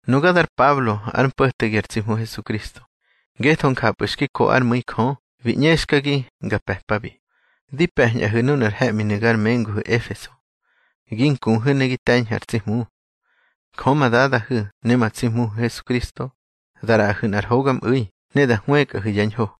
Nuga dar Pablo ár mpo̱tegi ar tsi Hmu Hesukristo, ngetho njapꞌu̱ xki ko ár mu̱i Jö bi ꞌñexkagi nga pe̱pabi. Di pe̱ñꞌahu̱ nunar he̱ꞌminu̱ gar menguhu̱ Efeso, gi nkuhu̱ ne gi te̱ñhu̱ ar tsi Hmu. Jö ma Dadahu̱ ne ma tsi Hmuhu̱ Hesukristo da ꞌraꞌahu̱ nꞌar hogamꞌu̱i ne da hwëkꞌahu̱ yá ñho.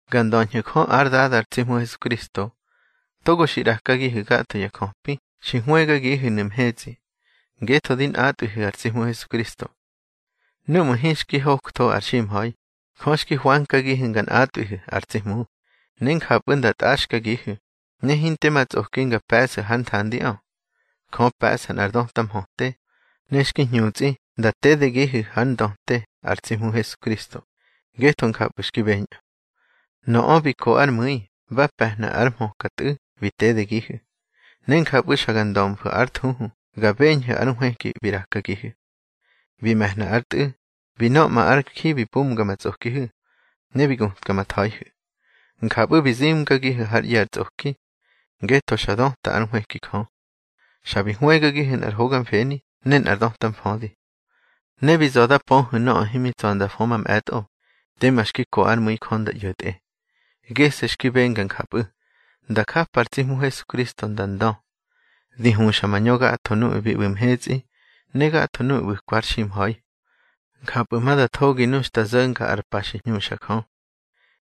Ga ndöñhu̱ Jö ár Dada ar tsi Hmu Hesukristo, togo xi ꞌrakagihu̱ gatho ya jöpi xi ꞌwegagihu̱nu̱ mhetsꞌi, ngetho di nꞌatꞌwihu̱ ar tsi Hmu Hesukristo. Núꞌmu̱ hinxki hoktho ar ximha̱i, Jö xki hwankagihu̱ nga nꞌatꞌwihu̱ ar tsi Hmu, ne njapꞌu̱ nda tꞌaxkagihu̱, ne hinte ma tsꞌoki nga pe̱ꞌsu̱ hár nthandiꞌö. Jö pe̱ꞌsa nꞌar döta mhöte, ne xki hñutsꞌi nda tedegihu̱ hár ndöte ar tsi Hmu Hesukristo, ngetho njapꞌu̱ xki beñꞌö. Nöꞌö bi ko ár mu̱i ba pe̱hna ár hmöka Tꞌu̱ bi tedegihu̱, ne njapꞌu̱ xa ga ndömfu̱ ár thuhu ga beñhu̱ ár nhwëki bi ꞌrakagihu̱. Bi me̱hna ár Tꞌu̱, bi nöꞌma ár ji bi pumga ma tsꞌokihu̱, ne bi gutka ma tha̱ihu̱. Njapꞌu̱ bi zimgagihu̱ hár ꞌye̱ ar tsꞌoki, ngetho xa döta ár nhwëki Jö. Xa bi hwëgagihu̱ nꞌar hoga mfeni ne nꞌar döta mfödi. Ne bi za̱ da pöhu̱ nöꞌö himi tsa̱ nda fö mamꞌe̱tꞌo, tema xki ko ár mu̱i Jö nda ꞌyo̱tꞌe. Gese̱ xki benga njapꞌu̱, nda njapa ar tsi Hmu Hesukristo nda ndö, di huxa mañö gatho nuꞌu̱ bi ꞌbu̱ mhetsꞌi ne gatho nuꞌu̱ ꞌbu̱kwa har ximha̱i. Njapꞌu̱ ma da thogi nu xta zo̱nga ar pa xi hñuxa Jö.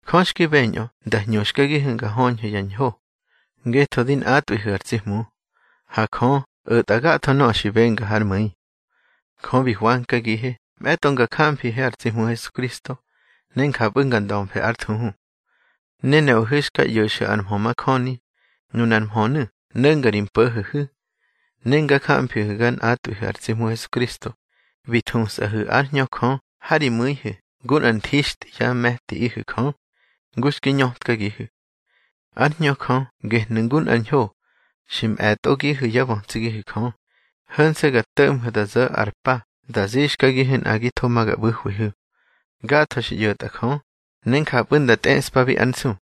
Jö xki beñꞌö nda hñuxkagihu̱ nga höñhu̱ yá ñho, ngetho di nꞌatꞌwihu̱ ar tsi Hmu. Ha Jö o̱tꞌa gatho nöꞌö xi benga hár mu̱i. Jö bi hwankagihe mꞌe̱tꞌo nga jamfihe ar tsi Hmu Hesukristo ne njapꞌu̱ nga ndömfe ár thuhu. Ne nuꞌahu̱ xka ꞌyo̱xu̱ ar mhö majöni, nunar mhönu̱ no̱nga ri mpo̱ho̱hu̱. Ne nga jamfihu̱ ga nꞌatꞌwihu̱ ar tsi Hmu Hesukristo, bi thusꞌahu̱ ár Hñö Jö ha ri mu̱ihu̱ ngu nꞌar nthixtꞌi yá me̱tiꞌihu̱ Jö, ngu xki ñötkagihu̱. Ár Hñö Jö gehnu̱ ngu nꞌar ñho xi mꞌe̱tꞌogihu̱ yá bötsigihu̱ Jö, ho̱nse̱ ga to̱ꞌmhu̱ da zo̱ ar pa da zixkagihu̱ nꞌagitho ma ga ꞌbu̱hwihu̱. Gatho xi ꞌyo̱tꞌa Jö, ne njapꞌu̱ nda tꞌeꞌspabi ár nsu.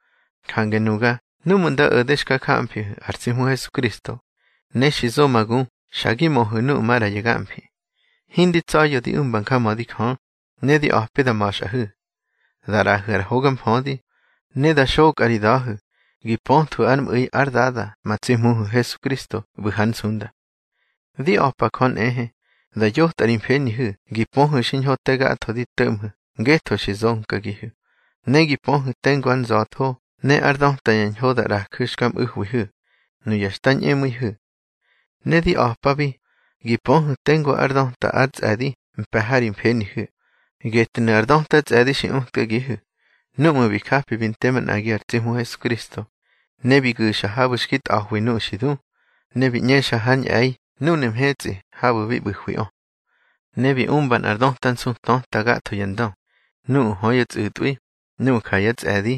Jange nuga núꞌmu̱ nda o̱de xka jamfihu̱ ar tsi Hmu Hesukristo, ne xi zo ma gu xa gi möhu̱ nuꞌu̱ maꞌra ya gamfi, hindi tsa̱ya̱ di umba njamödi Jö, ne di a̱pi da ma̱xꞌahu̱, da ꞌraꞌahu̱ ar hoga mfödi, ne da xokꞌa ri da̱hu̱ gi pöthwu̱ ár mꞌu̱i ár Dada ma tsi Hmuhu̱ Hesukristo ꞌbu̱ hár nsunda. Di a̱pa Jö nꞌehe da yotꞌa ri mfenihu̱ gi pöhu̱ xiñho te gatho di to̱ꞌmhu̱ ngetho xi zonkagihu̱, ne gi pöhu̱ tengu ár nza̱tho ne ár döta ya ñho da ꞌraju̱ xka mꞌu̱hwihu̱, nuya xta ñꞌemu̱ihu̱. Ne di a̱pabi gi pöhu̱ tengu ár döta ár tsꞌe̱di mpe̱ ha ri mfenihu̱. Getnu̱ ar döta tsꞌe̱di xi utkagihu̱, núꞌmu̱ bi japi bi nte manꞌagi ar tsi Hmu Hesukristo, ne bi gu̱xa habu̱ xki tꞌa̱hwi nuꞌu̱ xi du, ne bi ꞌñexa hár ñꞌe̱i núnu̱ mhetsꞌi habu̱ bi ꞌbu̱hwiꞌö. Ne bi umba nꞌar döta nsu töta gatho ya ndö, nuꞌu̱ hö yá tsꞌu̱tꞌwi, nuꞌu̱ ja yá tsꞌe̱di,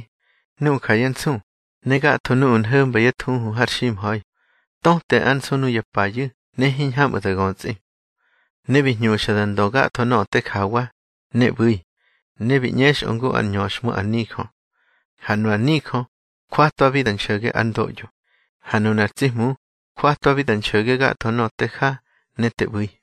nuꞌu̱ ja yá nsu, ne gatho nuꞌu̱ nho̱mba yá thuhu har ximha̱i, töte ár nsu nuya payu̱ ne hiñhamꞌu̱ da götsꞌi. Ne bi hñuxa da ndö gatho nöꞌö te jawa ne ꞌbu̱i, ne bi ꞌñexꞌö ngu ár ñöxhmu ar nijö. Ha nu ar nijö jwatwabi da nxo̱ge ár ndoꞌyo, ha nunar tsi Hmu jwatwabi da nxo̱ge gatho nöꞌö te ja ne te ꞌbu̱i.